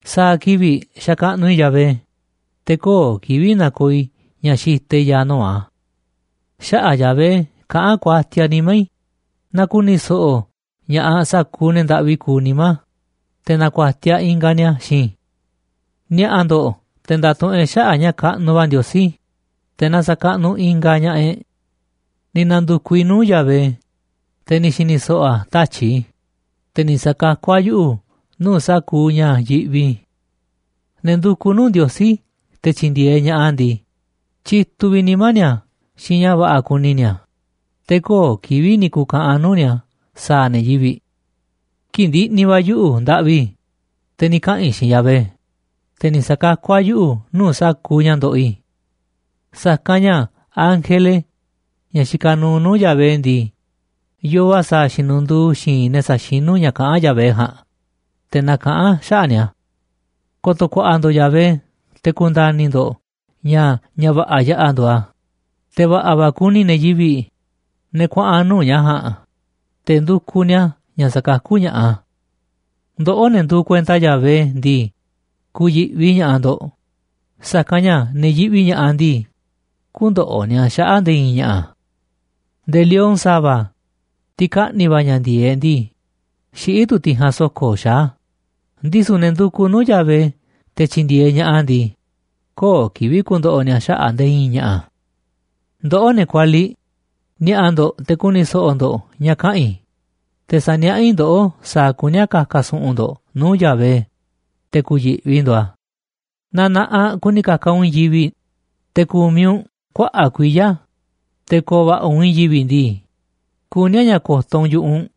Sa̱a̱ kivi̱ꞌ sa̱kaꞌnuꞌ i̱ Yahvé, te̱ köo̱ꞌ kivi̱ꞌ na̱ko̱o̱ i̱ ña̱ xitaꞌ i̱ ya̱a̱ nuu̱ꞌ a̱. Xaꞌa̱ꞌ Yahvé kaꞌán kuatiaꞌ nimá i̱, na ku̱ni̱ so̱ꞌo̱ ña̱ꞌaꞌ sa̱kuuꞌ ne̱ ndaꞌvi kuuꞌ nimá, te̱ na̱ku̱a̱tiaꞌ ingaꞌ ni̱a̱ xiinꞌ i̱. Ni̱a̱ꞌa̱ ndo̱ꞌ te̱ nda̱tuꞌunꞌ e̱ꞌ xaꞌa̱ꞌ ña̱ kaꞌnuꞌ va̱ Ndiosí, te̱ na sa̱kaꞌnuꞌ ingaꞌ ña̱ꞌaꞌ e̱ꞌ. Ni̱ na̱ndu̱kuꞌ i̱ nuu̱ꞌ Yahvé, te̱ ni̱ xi̱ni̱ so̱ꞌo̱ a̱ tatyi̱ꞌ i̱, te̱ ni̱ sa̱kakú a̱ yuꞌu̱ nuu̱ꞌ sa̱kuuꞌ ña̱ yiꞌvi i̱. Ne̱ ndukuꞌ nuu̱ꞌ Ndiosí te̱ tyi̱ndi̱e̱eꞌ ña̱ꞌaꞌ a̱ ndii, tyituꞌ vi̱ꞌ nimá ni̱a̱ xiinꞌ ña̱ va̱ꞌa̱ kuni ni̱a̱, te̱ köo̱ꞌ kivi̱ꞌ ni̱ ku̱ka̱ꞌa̱n nuu̱ꞌ ni̱a̱ sa̱a̱ ne̱ yivi̱ꞌ. Kii̱ꞌ ndiꞌni̱ va̱ yuꞌu̱ ndaꞌvi, te̱ ni̱ kaꞌa̱n i̱ xiinꞌ Yahvé, te̱ ni̱ sa̱kakú a̱ yuꞌu̱ nuu̱ꞌ sa̱kuuꞌ ña̱ ndoꞌoꞌ i̱. Sa̱kanꞌ ña̱ ángele, ña̱ xikaꞌ nuuꞌ nuu̱ꞌ Yahvé ndii, yoo a̱ sa̱a̱ xinundu̱u̱ xi̱i̱nꞌ ne̱ saxinú ña̱ kaꞌán Yahvé ja̱a̱nꞌ, te̱ nakaꞌán a̱ xaꞌa̱ꞌ ni̱a̱. Ko̱to̱ ku̱a̱ꞌa̱ ndo̱ꞌ Yahvé te̱ ku̱nda̱ni̱ ndo̱ꞌ ña̱ ña̱ va̱ꞌa̱ yaꞌa̱ nduuꞌ a̱, te̱ va̱ꞌa̱ va̱ kuni ne̱ yivi̱ꞌ, ne̱ kuaꞌa̱n nuu̱ꞌ ña̱ ja̱a̱nꞌ, te̱ ndukuꞌ ni̱a̱ ña̱ sa̱kakú ña̱ꞌaꞌ a̱. Ndoꞌó, ne̱ nduuꞌ kuenta Yahvé ndii, ku̱yi̱ꞌvi ña̱ꞌaꞌ ndo̱ꞌ, sa̱kanꞌ ña̱ ne̱ yiꞌvi ña̱ꞌaꞌ ndii, kü̱ndo̱ꞌo̱ ni̱a̱ xaꞌa̱ꞌ nde̱e̱ i̱i̱n ña̱ꞌa̱. Nde̱e̱ lion sa̱va̱, tiꞌ kaꞌni̱ va̱ ña̱ ndi̱e̱eꞌ ndii, xiꞌí tu̱ tiꞌ ja̱a̱nꞌ so̱ko̱ xaá, ndisu̱ ne̱ ndukuꞌ nuu̱ꞌ Yahvé te̱ tyi̱ndi̱e̱eꞌ ña̱ꞌaꞌ a̱ ndii, köo̱ꞌ kivi̱ꞌ ku̱ndo̱ꞌo̱ ni̱a̱ xaꞌa̱ꞌ nde̱e̱ i̱i̱n ña̱ꞌa̱. Ndoꞌó, ne̱ kualiꞌ, ni̱a̱ꞌa̱ ndo̱ꞌ te̱ ku̱ni̱ so̱ꞌo̱ ndo̱ꞌ ña̱ kaꞌa̱n i̱, te̱ sa̱niaꞌá i̱ ndoꞌó sa̱a̱ kuní a̱ ka̱ka̱ su̱ꞌu̱n ndo̱ꞌ nuu̱ꞌ Yahvé, te̱ ku̱yi̱ꞌvi ndo̱ꞌ a̱. Naaꞌ na̱ꞌaꞌ kuni ka̱ka̱ u̱nꞌ i̱i̱n yivi̱ꞌ, te̱ ku̱miꞌ u̱nꞌ kuaꞌa̱ꞌ kuiya̱, te̱ ko̱o̱ va̱ꞌa̱ u̱nꞌ i̱i̱n yivi̱ꞌ ndii, kuní a̱ ña̱ ko̱to̱ u̱nꞌ yu̱ꞌuꞌ u̱nꞌ,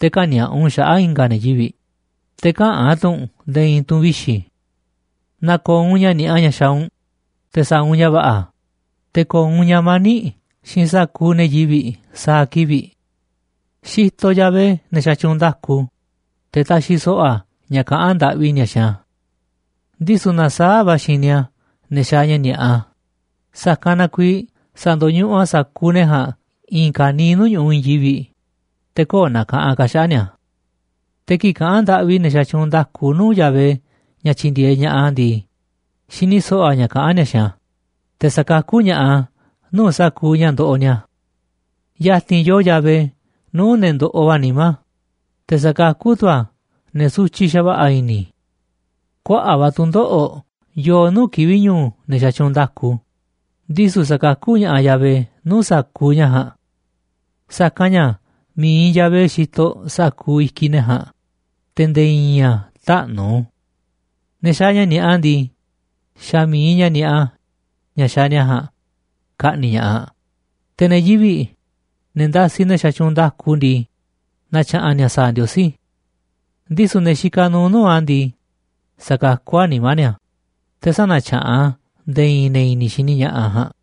te̱ kä̱ni̱a̱ꞌa u̱nꞌ xaꞌa̱ꞌ i̱nga̱ ne̱ yivi̱ꞌ, te̱ käꞌán tu̱ u̱nꞌ nde̱e̱ i̱i̱n tu̱ꞌu̱n vixi̱. Na̱ko̱o̱ u̱nꞌ ña̱ ni̱a̱ꞌa ña̱ xaaꞌ u̱nꞌ, te̱ sa̱a̱ u̱nꞌ ña̱ va̱ꞌa̱, te̱ ko̱o̱ u̱nꞌ ña̱ mani̱ꞌ xiinꞌ sa̱kuuꞌ ne̱ yivi̱ꞌ sa̱a̱ kivi̱ꞌ. Xitoꞌ Yahvé ne̱ xatyuunꞌ nda̱ku, te̱ taxiꞌ so̱ꞌo̱ a̱ ña̱ kaꞌán ndaꞌvi ni̱a̱ xiinꞌ a̱. Ndisu̱ nasaáꞌ va̱ a̱ xini a̱ ne̱ xaaꞌ ña̱ ni̱a̱ꞌa, sa̱kanꞌ na kuiiꞌ sa̱ndo̱ñuꞌuꞌ a̱ sa̱kuuꞌ ne̱ ja̱a̱nꞌ i̱i̱n ka̱niiꞌ nuu̱ꞌ ñu̱ꞌuꞌ i̱i̱n yivi̱ꞌ, te̱ köo̱ꞌ na̱ka̱ꞌanꞌ ka̱ xaꞌa̱ꞌ ni̱a̱. Te̱ kii̱ꞌ kaꞌán ndaꞌvi ne̱ xatyuunꞌ nda̱ku nuu̱ꞌ Yahvé ña̱ tyi̱ndi̱e̱eꞌ ña̱ꞌaꞌ a̱ ndii, xini so̱ꞌo̱ a̱ ña̱ kaꞌán ni̱a̱ xiinꞌ a̱, te̱ sa̱kakú ña̱ꞌaꞌ a̱ nuu̱ꞌ sa̱kuuꞌ ña̱ ndoꞌoꞌ ni̱a̱. Ya̱ti̱n yoo Yahvé nuu̱ꞌ ne̱ ndoꞌoꞌ va̱ nimá, te̱ sa̱kakú tu̱ a̱ ne̱ sutyiꞌ xa̱va̱ꞌa̱ i̱ni̱. Kuaꞌa̱ꞌ va̱ tu̱ndoꞌo̱ꞌ yoo nuu̱ꞌ kivi̱ꞌ ñu̱u̱ ne̱ xatyuunꞌ nda̱ku, ndisu̱ sa̱kakú ña̱ꞌaꞌ Yahvé nuu̱ꞌ sa̱kuuꞌ ña̱ ja̱a̱nꞌ. Sa̱kanꞌ ña̱ mi̱iꞌ Yahvé xitoꞌ sa̱kuuꞌ i̱kiꞌ ne̱ ja̱a̱nꞌ, te̱ nde̱e̱ i̱i̱n a̱ täꞌnu̱. Ne̱ xaaꞌ ña̱ ni̱a̱ꞌa ndii, xa̱ mi̱iꞌ ña̱ ni̱a̱ꞌa ña̱ xaaꞌ ni̱a̱ ja̱a̱nꞌ ka̱ꞌni̱ꞌ ña̱ꞌaꞌ, te̱ ne̱ yivi̱ꞌ, ne̱ ndasiꞌ ne̱ xatyuunꞌ nda̱ku ndii, na̱tya̱ꞌa̱n ni̱a̱ sa̱a̱ Ndiosí. Ndisu̱ ne̱ xikaꞌ nuuꞌ nuu̱ꞌ a̱ ndii, sa̱kakú a̱ nimá ni̱a̱, te̱ sä̱na̱tyaꞌan a̱ nde̱e̱ i̱i̱n ne̱ i̱ni̱ xini ña̱ꞌaꞌ ja̱a̱nꞌ.